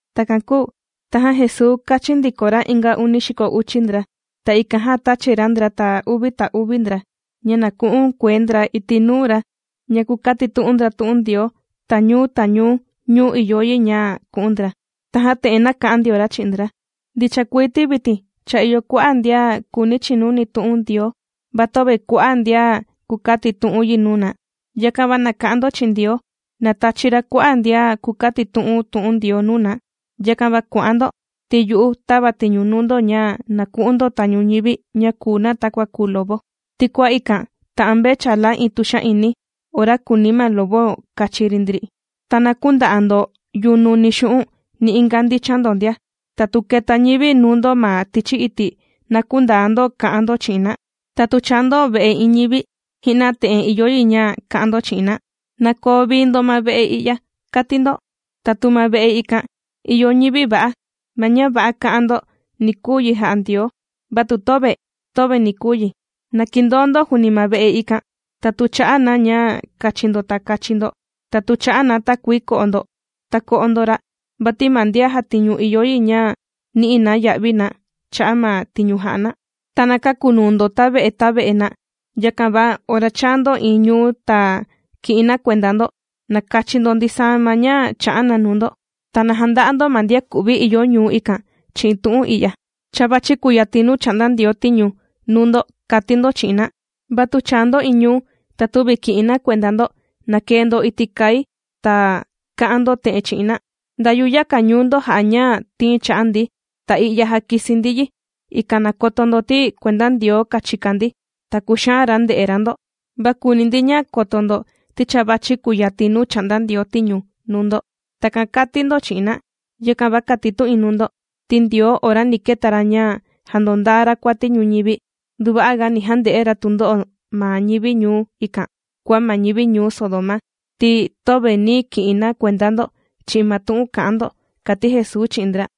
Takan kūu tajan Jesuu kāchin ndiko ra inga uni xiko uchi ndra, ta ikan jan tāchi ra ndra, ta uvi ta uvi ndra ña na ku'un kuee ndra iti' nuu ra ña kukatitu'un ndra tu'un Ndioo ta ñuu ta ñuu nuu ìyo yi ña ku'un ra. Tajan te'en nāka'an ndio ra chi'in ndra: ―Ndicha kuii ti vitin cha ìyo kua'a' ndian kùuni chinuni tu'un Ndioo, va töve kua'a' ndian kukatitu'un yi nuu na. Yakan va na ka'an ndo chi'in Ndioo na tachi ra kua'a' ndian kukatitu'un tu'un Ndioo nuu na. Yakan va kua'an ndo, ti yu'u tàva tiñu nuu ndo ña na ku'un ndo tañu ñivi ña kùu na takua kùu lobo. Ti kua ikan tà'an mvechala iin tuxa'ini ora kùuni ma lobo kachi ri ndri. Ta na künda'a ndo yunu ni xu'un' ni inga ndichan ndo ndia. Ta tu keta ñivi nuu ndo ma tichi iti' na kündaa ndo ka'an ndo chi'in na. Ta tu chaa ndo ve'e iin ñivi, ji'na te'en ìyo yi ña ka'an ndo chi'in na: “Na koo vii ndo ma ve'e i'ya”, kàti ndo. Ta tu ma ve'e ikan ìyo ñivi va'a, ma ña va'a ka'an ndo ni kuu yi jà'a Ndioo, va tu töve, töve ni kuu yi. Na kindoo ndo juuni ma ve'e ikan. Ta tu chà'a na ña kachi ndo ta kachi ndo. Ta tu chà'a na takuii ko'o ndo, ta ko'o ndo ra'. Vati ma ndian jàtiñu ìyo yi ña ni'i na ya'vi na cha'a' ma tiñu jà'a na. Ta na käkunuu ndo tave'e tave'e na. Yakan va ora chàa ndo iin ñuu ta ki'in na kuenda ndo, ta kachi ndo ndisaa ma ña chà'a na nuu ndo. Ta na janda'a ndo ma ndian ku'vi ìyo ñuu ikan chi'in tu'un i'ya: “Cha vàchi kuyatin nuu chà'nda Ndioo tiñu nuu ndo”, kàti ndo chi'in na. Va tu chàa ndo iin ñuu, ta tüvi ki'in na kuenda ndo, na kee ndo iti' kai ta ka'an ndo te'en chi'in na: “Nda yuyaka ñuu ndo jà'a ña tìin cha'a ndi ta i'ya jàkisi ndi yi, ikan na koto ndo ti kuenda Ndioo kàchika ndi ta kùxaan ra nde'e ra ndo. Va kùuni ndi ña koto ndo ti cha vàchi kuyatin nuu chà'nda Ndioo tiñu nuu ndo.” Takan kàti ndo chi'in na. Yakan va kàtitu'in nuu ndo ti Ndioo ora ni keta ra ña jàndondaa ra kuati ñuñivi, nduva'a ga ni jande'e ra tundo'o ma ñivi ñuu ikan kua ma ñivi ñuu Sodoma, ti töve nī ki'in na kuenda ndo chi'in ma tu'un kà'an ndo ―kàti Jesuu chi'in ndra.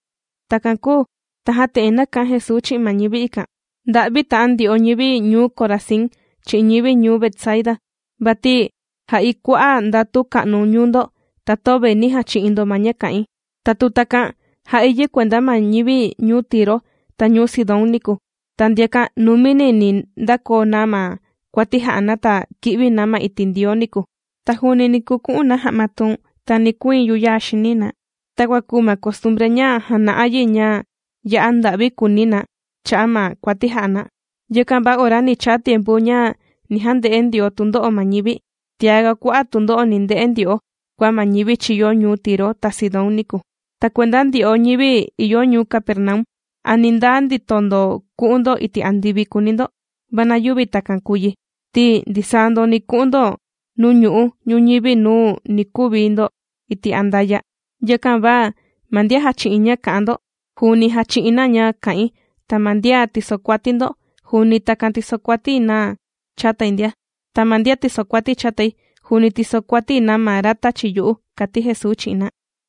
Takan kūu tajan te'en nāka'an Jesuu chi'in ma ñivi ikan: ―¡Nda'vi ta'an ndyo'o ñivi ñuu Corazín chi'in ñivi ñuu Betsaida! Vati jā'i kua'a' ndatu ka'nu ñuu ndo ta töve nī jachi'in ndo ma ña kā'in. Ta tu takan jā'i yi kuenda ma ñivi ñuu Tiro ta ñuu Sidón niku, ta ndiakan numini ni ndakoo na ma kuati jà'a na ta ki'vi na ma iti' Ndioo niku. Ta juuni ni kuku'un na ja'ma tuun ta ni kuiin yuyaa xini na takua kùu ma costumbre ña jàna'a yi ña ya'a nda'vi kùuni na cha'a' ma kuati jà'a na. Yakan va ora ni chaa tiempu ña ni jande'e Ndioo tundo'o ma ñivi, tiaga kua'a' tundo'o ni nde'e ndyo'o kua ma ñivi chīyo ñuu Tiro ta Sidón niku. Ta kuenda ndyo'o ñivi ìyo ñuu Capernaum, ¿a ni ndaa ndito ndo ku'un ndo iti' andivi?, kùuni ndo. Va na yüvi takan kùu yi ti ndisaa ndo ni ku'un ndo nuu ñu'u' ñuñivi nuu ni kuvi ndo iti' andaya'. Yakan va ma ndian jàchi'in ña kà'an ndo juuni jàchi'in na ña kà'in, ta ma ndian tìsokuati ndo juuni takan tìsokuati na chatai ndia. Ta ma ndian tìsokuati chatai juuni tìsokuati na ma ra tāchi yu'u ―kàti Jesuu chi'in na.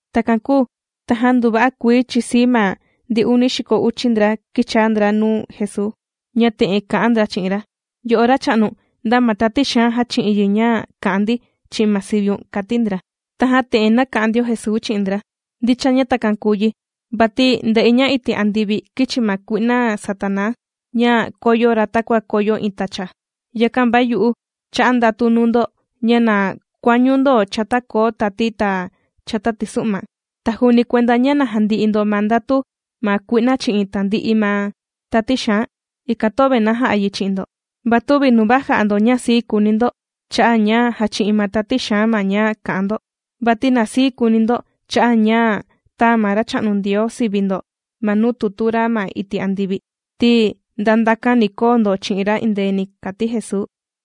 Takan kūu tajan nduva'a kuii chìsii ma ndi uni xiko uchi ndra kìchaa ndra nuu Jesuu, ña te'en kà'an ndra chi'in ra: ―Yo'o Racha'nu, nda ma tati xaan jāchi'in yi ña kā'an ndi chi'in ma siviun ―kàti ndra. Tajan te'en nāka'an ndio Jesuu chi'in ndra: ―Ndicha ña takan kūu yi vati ndē'i ña iti' andivi kīchi ma kui'na Satanaa ña kōyo ra takua kòyo iin tacha. Yakan va yu'u chā'a ndatu nuu ndo ña na kuañu ndo chata koo tati ta chata tisu'ma, ta juuni kuenda ña na jandi'i ndo ma ndatu ma kui'na chi'in tandi'i nuu tati xaan, ikan töve nàja'a yi chi'in ndo. Va tüvi nuva jà'a ndo ña sii kùuni ndo cha'a' ña jàchi'in ma tati xaan ma ña kà'an ndo, vati na sii kùuni ndo cha'a' ña cha tāa ma Racha'nu Ndioo sivi ndo ma nuu tutu ra ma iti' andivi, ti nda ndakan ni koo ndo chi'in ra endeeni ―kàti Jesuu.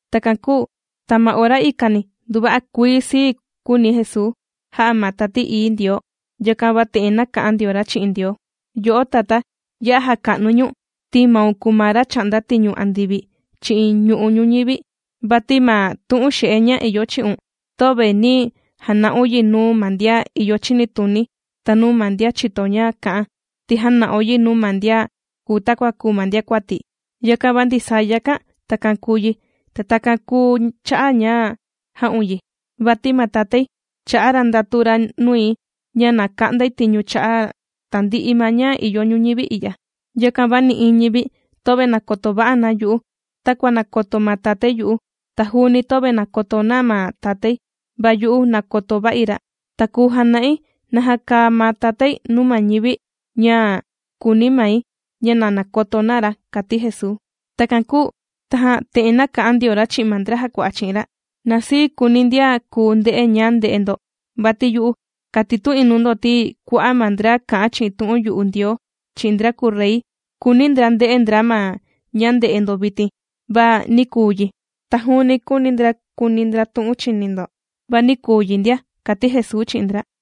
Takan kūu ta ma ora ikani nduva'a kuii sii kūuni Jesuu, jā'a ma Tati Ií Ndioo. Yakan va te'en nāka'an ndio ra chi'in Ndioo: ―Yo'o Tatá, ya'a jàka'nui ñu̱n ti maun kùu ma ra chà'nda tiñu andivi, chi'in ñu'u' ñuñivi, vati ma tu'un xe'e ña ìyo chi'un, töve nī jana'un yi nuu ma ndian ìyo chinituni ta nuu ma ndian chìto ña kà'an, ti jāna'un yi nuu ma ndian kùu takua kùu ma ndiakuati. Yakan va ndisaa yakan takan kūu yi, ta takan kūu cha'a' ña jā'un yi. ’Vati ma Tatái chā'a ra ndatu ra nui ña na ka'ndai tiñu cha'a' tandi'i ma ña ìyo ñuñivi i'ya. Yakan va nï'iin ñivi töve nàkoto va'a na yu'u takua nàkoto ma Tatái yu'u, ta juuni töve nàkoto na ma Tatái va yu'u nàkoto va'i ra. Ta kùu jana'i naja kàa ma Tatái nuu ma ñivi ña kùuni mai, ña na nakoto na ra ―kàti Jesuu. Takan kūu tajan te'en nāka'an ndio ra chi'in ma ndra jàkua'a chi'in ra: ―Na sii kuuni ndian kùu nde'e ña ndè'e ndo. Vati yu'u kàtitu'in nuu ndo ti kua'a' ma ndra kà'an chi'in tu'un yu'u Ndioo chi'in ndra kùu Rey, kūuni ndra nde'e ndra ma ña ndè'e ndo vitin, va nī kuu yi. Ta juuni kūuni ndra kuni ndra tu'un chìni ndo va nī kuu yi ndia ―kàti Jesuu chi'in ndra.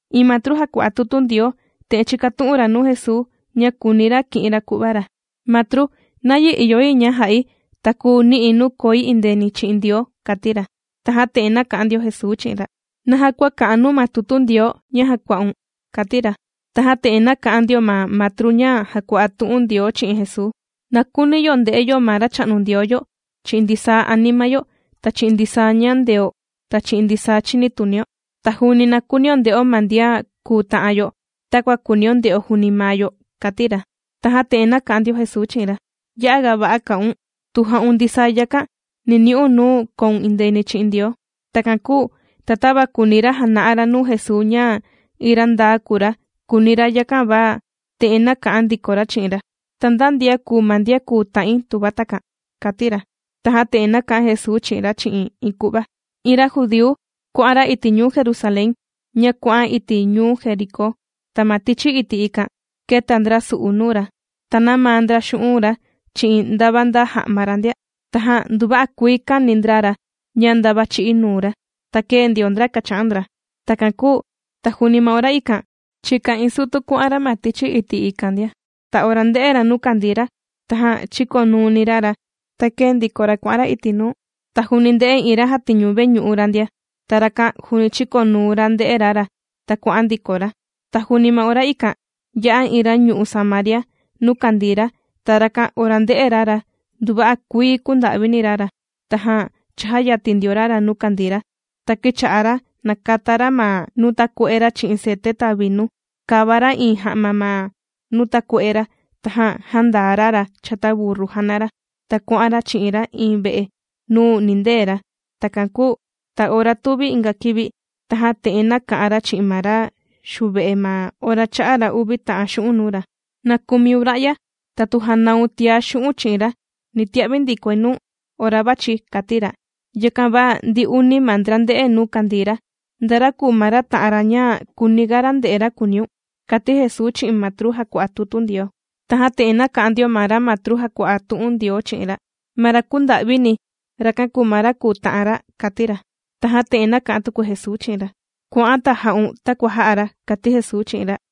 Iin matru jàkua'a tutu Ndioo te'en chīkatu'un ra nuu Jesuu ña kùuni ra ki'in ra ku'va ra: ―Matru, ¿nayi ìyo yi ña ja'i ta kùu ni'i̱ nuu koi indeeni chi'in Ndioo? ―kàti ra. Tajan te'en nāka'an ndio Jesuu chi'in ra: ―¿Naja kua kà'an nuu ma tutu Ndioo ña jàkua'un? ―kàti ra. Tajan te'en nāka'an ndio ma matru ña jàkua'a tu'un Ndioo chi'in Jesuu: ―Na kuuni yo nde'o ma Racha'nu Ndioo yo chi'in ndisaa anima yo ta chi'in ndisaa ñandeo ta chi'in ndisaa chinitunio. Ta juuni na kuunio nde'o ma ndian kùu ta'an yo takua kùunio nde'o juuni maa yo ―kàti ra. Tajan te'en nāka'an ndio Jesuu chi'in ra: ―Ya'a ga va'a kā'un. Tu ja'un ndisaa yakan ni ni'un nuu koun indeeni chi'in Ndioo. Takan kūu ta tava kùuni ra jana'a ra nuu Jesuu ña iin ra ndaa kùu ra, kùuni ra, yakan va te'en nāka'an ndiko ra chi'in ra: ―¿Ta nda ndian kùu ma ndian kùu ta'in tuva takan? ―kàti ra. Tajan te'en nāka'an Jesuu chi'in ra chi'in iin ku'va: ―Iin ra judíu kuà'an ra iti' ñuu Jerusalén ña kuà'an iti' ñuu Jericó. Ta ma tichi iti' ikan, kēta ndra su'u nuu ra, ta nāmaa ndra xu'un' ra chi'in ndava nda ja'ma ra ndia. Tajan nduva'a kuii kāni ndra ra ña ndava chī'í nuu ra. Ta kēe ndio ndra kàcha'an ndra. Takan kūu ta juuni ma ora ikan chìka iin sutu kuà'an ra ma tichi iti' ikan ndia. Ta ora ndē'e ra nuu kàndii ra, tajan chīkonuuni ra ra ta kēe ndiko ra kuà'an ra iti' nuu. Ta juuni ndē'e iin ra jàtiñu veñu'u ra ndia. Ta rakan juuni chīkonuu ra ndè'e ra ra, ta kuà'an ndiko ra. Ta juuni ma ora ikan yā'a iin ra ñu'u' Samaria nuu kàndii ra, ta rakan ora ndē'e ra ra, nduva'a kuii kūnda'vini ra ra. Tajan chājayatin ndio ra ra nuu kàndii ra, ta kīcha'a ra nàkata ra ma nuu takue'e ra chi'in cete ta vinu, kāva ra iin ja'ma ma nuu takue'e ra, tajan jāndaa ra ra chata burru jàna ra, ta kuà'an ra chi'in ra iin ve'e nuu ni nindee ra. Takan kūu ta ora tuvi inga kivi, tajan te'en nāka'an ra chi'in ma ra xuve'e ma ora chā'a ra uvi ta'an xu'un' nuu ra: “Na kumiun ra'ya, ta tu janaun tiá xu'u̱n' chi'in ra, ni tia'vi ndikoi nuu̱n ora vàchi̱”, kàti ra. Yakan va ndi uni ma ndra ndē'e nuu kàndii ra. ¿Nda ra kùu ma ra ta'an ra ña kūuni ga nde'e ra kùuniun? ―kàti Jesuu chi'in ma matru jàkua'a tutu Ndioo. Tajan te'en nāka'an ndio ma ra matru jàkua'a tu'un Ndioo chi'in ra: ―Ma ra kūnda'vini, rakan kùu ma ra kùu ta'an ra ―kàti ra. Tajan te'en nāka'an tuku Jesuu chi'in ra: ―¡Kua'an ta ja'un takua jā'a ra! ―kàti Jesuu chi'in ra.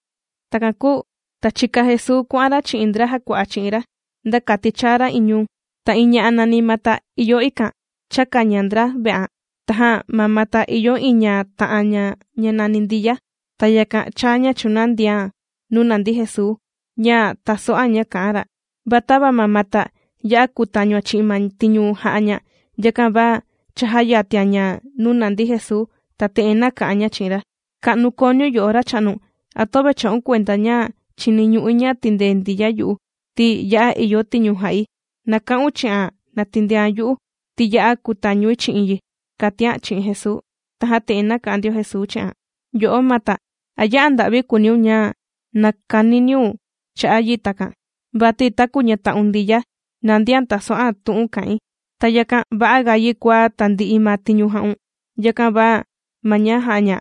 Takan kūu ta chīka Jesuu kuà'an ra chi'in ndra jàkua'a chi'in ra nda kati chaa ra iin ñuu. Ta iin ña'a nàni Mata ìyo ikan, chāka ña ndra ve'an. Tajan ma Mata ìyo iin ña ta'an ña ña nàni Ndiya. Ta yakan chāa ña chūnandian nuu nàndi Jesuu ña tàso'an ña kà'an ra. Va tava ma Mata ya'a kūtañuan chi'in ma tiñu jà'a ña, yakan va cha jāyatian ña nuu nàndi Jesuu, ta te'en nāka'an ña chi'in ra: ―Ka'nu kooniun yo'o Racha'nu. ¿A töve chà'un kuenda ña chìniñu'i ña tindee Ndiya yu'u ti ya'a ìyo tiñu jà'i? Na ka'un chi'an na tindean yu'u, ti ya'a kutañui chi'in yi ―kàtian chi'in Jesuu. Tajan te'en nāka'an ndio Jesuu chi'an: ―Yo'o Mata, ¿a ya'a nda'vi kùuniun ña nàkaniniun cha'a' yi takan? Vati taku ñata'un Ndiya nàndian tàso'an tu'un kà'in. Ta yakan va'a ga yi kua tandi'i ma tiñu jà'un. Yakan va ma ña jà'a ña,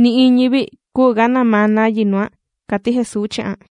nï'iin ñivi küu ga namaa na yi nuan ―kàti Jesuu chi'an.